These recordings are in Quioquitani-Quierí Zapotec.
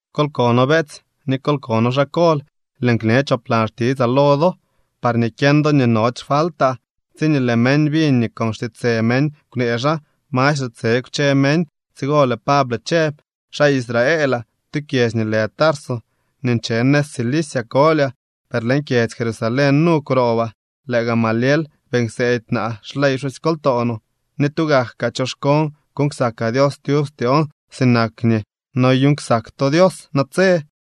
—Kol kono, beetsy, ni kol kono xaa kol. Lëën kñe choplan xtitsaa lo do parñee kyeñ do nii nody xfaltaa. Tsiñee lëë meñ biñ nii con xtiitsë meñ kwnee xaa, mastre tse kwche meñ. Tsigo lëë Pable chëb: —Xaa Israelaa. Tu kyedzy nii lë Tarso nii nche nëz Cilicia kolyaa, per leñ kyedzy Jerusalén nu kwroobaa. Lëë Gamaliel beeñ kseedy naa xley pxusykoltoo no, ni tugak kaa choxkoon kuuñ ksakaa Dios tyub styoon sinak nii noyuuñ ksak to Dios natse.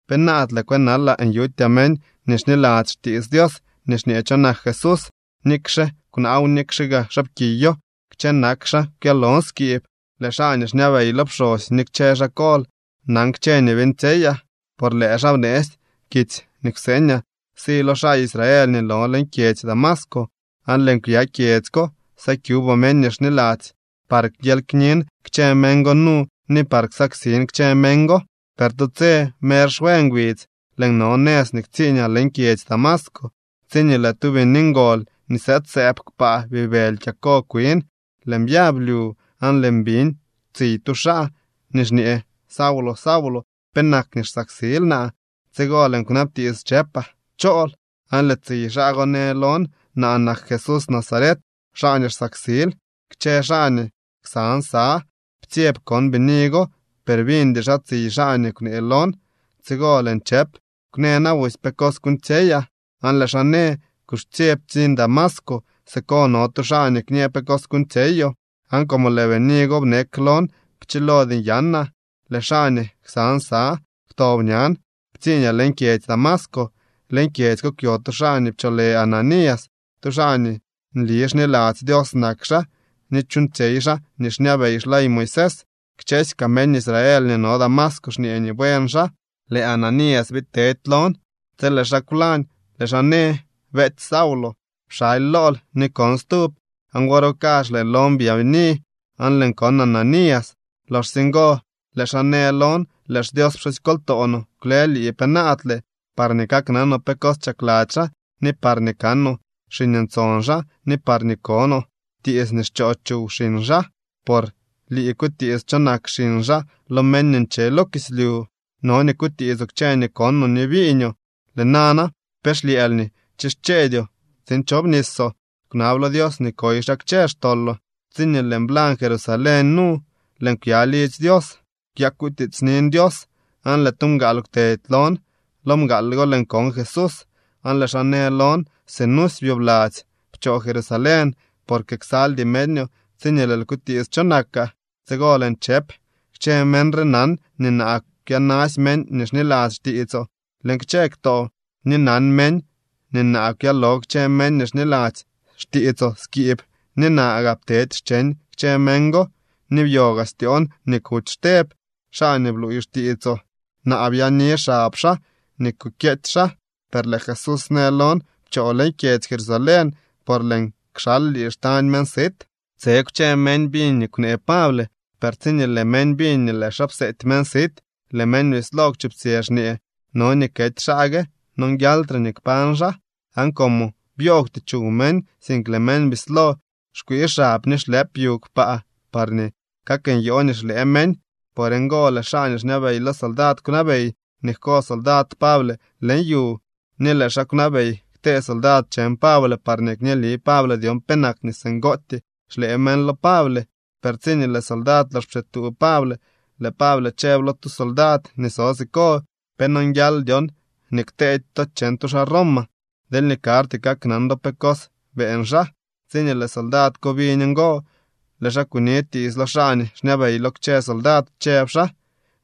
Penaadle kwënalaa nyutyaa meñ nii xniladzy xtiits Dios nii xñee cho nak Jesús. Nikxe kwnaaw, nikxe gaa xaapkiyo, kchë nak xaa kwyalon skiib. Lëë xaa nii xñabey lo pxosy ni kchë xaa kol nan kchë nii beeñtsyeyaa, por lëë xaa bneetsy kitsy nii kwseeñaa si lo xaa Israel nii no leñ kyedzy Damasco, aan lëën kwya kyedzy ko sakyubaa meñ nii xniladzy par kyely knin kchë meñ go nu ni par ksaksin kchë meñ go. ’Per tu tse mer xwe ngbidz, lëën no nëz nii ktsiiñaa leñ kyedzy Damasco, tsiñee lëë tu bini ngol nii sëëdsëëb kpaa bibëly kyako kwin. Lëën byab lyu, aan lëën biñ tsiy tu xaa nii xñee: “Saulo, Saulo, ¿penak nii xsaksil naa?” Tsigo lëën kwnabtiits chëpaa: “¿Chool?” Aan lëë tsiy xaa go në lon: “Naa nak Jesús Nazaret, xaa nii xsaksil.” Kchë xaa nii ksan sa ptsyeb kon bini go, per biñdy xaa tsiy xaa nii kwnee lon. Tsigo lëën chëp: “Kwnë na busy pe cos kuuñtsyeyaa.” Aan lëë xaa në: “Kuxche, ptsiñ Damasco. Siko no tu xaa nii kñë pe cos kuñoo.” Aan como lëë bini go bnek lon, pchilody nyanaa. Lëë xaa nii ksan sa kwtob ñan, ptsiiñaa leñ kyedzy Damasco. ’Leñ kyedzy ko kwyo tu xaa nii pcholë Ananías. Tu xaa nii nli xniladzy Dios nak xaa ni chuuñtsyey xaa nii xñabey xley Moisés. Kchësy kaa meñ Israel nii no Damasco xñee nii buen xaa. Lëë Ananías biid tedy lon. Tsi lëë xaa kwlañ, lëë xaa në: “Beetsy Saulo, pxaly lool ni kon stub.” Aan wor go kazh lëë lon byaabini aan lëën kon Ananías. Loxsye ngo lëë xaa në lon: “Lëë xDios pxusykoltoo no kwle lii penaadle parñee kaknanoo pe cos chakladzy xaa ni parñee kanoo xiñ ntson xaa ni parñee konoo tiits nii xchoo chuw xiñ xaa. Por lii kutiits cho nak xiñ xaa lo meñ nii nche lo kislyu. No nii kutiitsoo kchë nii konoo ni biiñoo. Lëë nana ¿pe xlyëël nii chischeedyoo tsiin chobnisoo? Kwnab lo Dios nii koy xaa kchë xtoloo.” ’Tsiñee lëën blañ Jerusalén nu, lëën kwya lidzy Dios, kwyakutiitsnin Dios, aan lëë tu mgaal kwtedy lon. Lo mgaal go lëën kon Jesús, aan lëë xaa në lon: “Sinusy byobladzy pchoo Jerusalén, porque ksaldy meñoo tsiñee lëël kutiits cho nakaa.” Tsigo lëën chëp: “Kchë meñ re nan nii naa kwyanasy meñ nii xniladzy xtiitsoo leñ kchë ktoo, ni nan meñ nii naa kwyalo kchë meñ nii xniladzy xtiitsoo skiib ni naa gaa ptedy xcheñ kchë meñ go. Ni byo gaa styoon nii kuty Xteb, xaa nii bluuy xtiitsoo. Naa byaani xab xaa nii kukyeety xaa.” Per lëë Jesús në lon: “Pchoo leñ kyedzy Jerusalén, por lëën kxal lii xtañ meñ sit.” Tse kwche meñ biñ nii kwnee Pable, per tsiñee lëë meñ biñ nii lëë xaa pseety meñ sit, lëë meñ bislo kwchuptsyë xñee: —¡No nii kety xaa gue! ¡Nonguialtre nii kpañ xaa! Aan como byoogwty chuw meñ, sink lëë meñ bislo xkwii xab ni xlëp yu kpaa parñee kaknyoo nii xlëë meñ, por ngo lëë xaa nii xñabey lo soldad kwnabey nii jko soldad Pable leñ yu, ni lëë xaa kwnabey ktee soldad cheñ Pable parñee kñeeli Pable dyon penak nii singootyee xlëë meñ lo Pable. Per tsiñee lëë soldad lox pxituu Pable, lëë Pable chëb lo tu soldad nii so siko: —¿Pe nonguial dyon nii kteedy to cheñ tu xaa Roma, deelñee karty kaknan do pe cos beeñ xaa? Tsiñee lëë soldad ko biñ ngo, lëë xaa kuni tiits lo xaa nii xñabey lo kchë soldad, chëb xaa: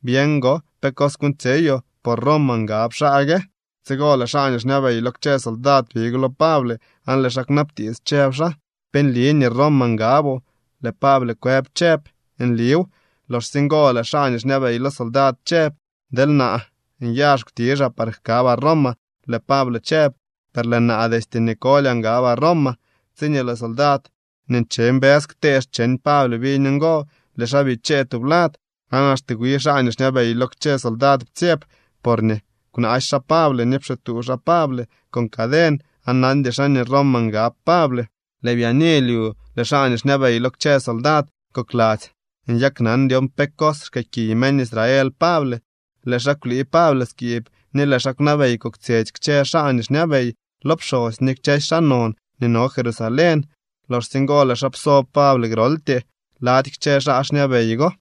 —Byeñ gon pe cos kuuñtsyeyoo, por Roma ngab xaa gue. Tsigo lëë xaa nii xñabey lo kchë soldad big lo Pable, aan lëë xaa kwnabtiits, chëb xaa: —¿Pe nli nii Roma ngaboo? Lëë Pable kwëb chëb: —Nliw. Loxsye ngo lëë xaa nii xñabey lo soldad chëb: —Deel naa nyazh kwtizhaa par jkabaa Roma. Lëë Pable chëb: —Per lëë naa destye nii kolyaa ngabaa Roma. Tsiñee lëë soldad nii nche mbës ktee cheñ Pable biñ ngo, lëë xaa bichee tublad. Aan axte wi xaa nii xñabey lo kchë soldad ptsyeb, porñee kwnaasy xaa Pable ni pxituu xaa Pable con caden aan nandy xaa nii Roma ngab Pable. Lëë byaani lyu lëë xaa nii xñabey lo kchë soldad kokladzy nyaknan dyon pe cos xkëëkiy meñ Israel Pable. Lëë xaa kwlii Pable skiib, ni lëë xaa kwnabey koktsyetsy kchë xaa nii xñabey lo pxosy ni kchësy xaa non nii no Jerusalén. Loxsye ngo lëë xaa pso Pable groltyee lady kchë xaa xñabey go.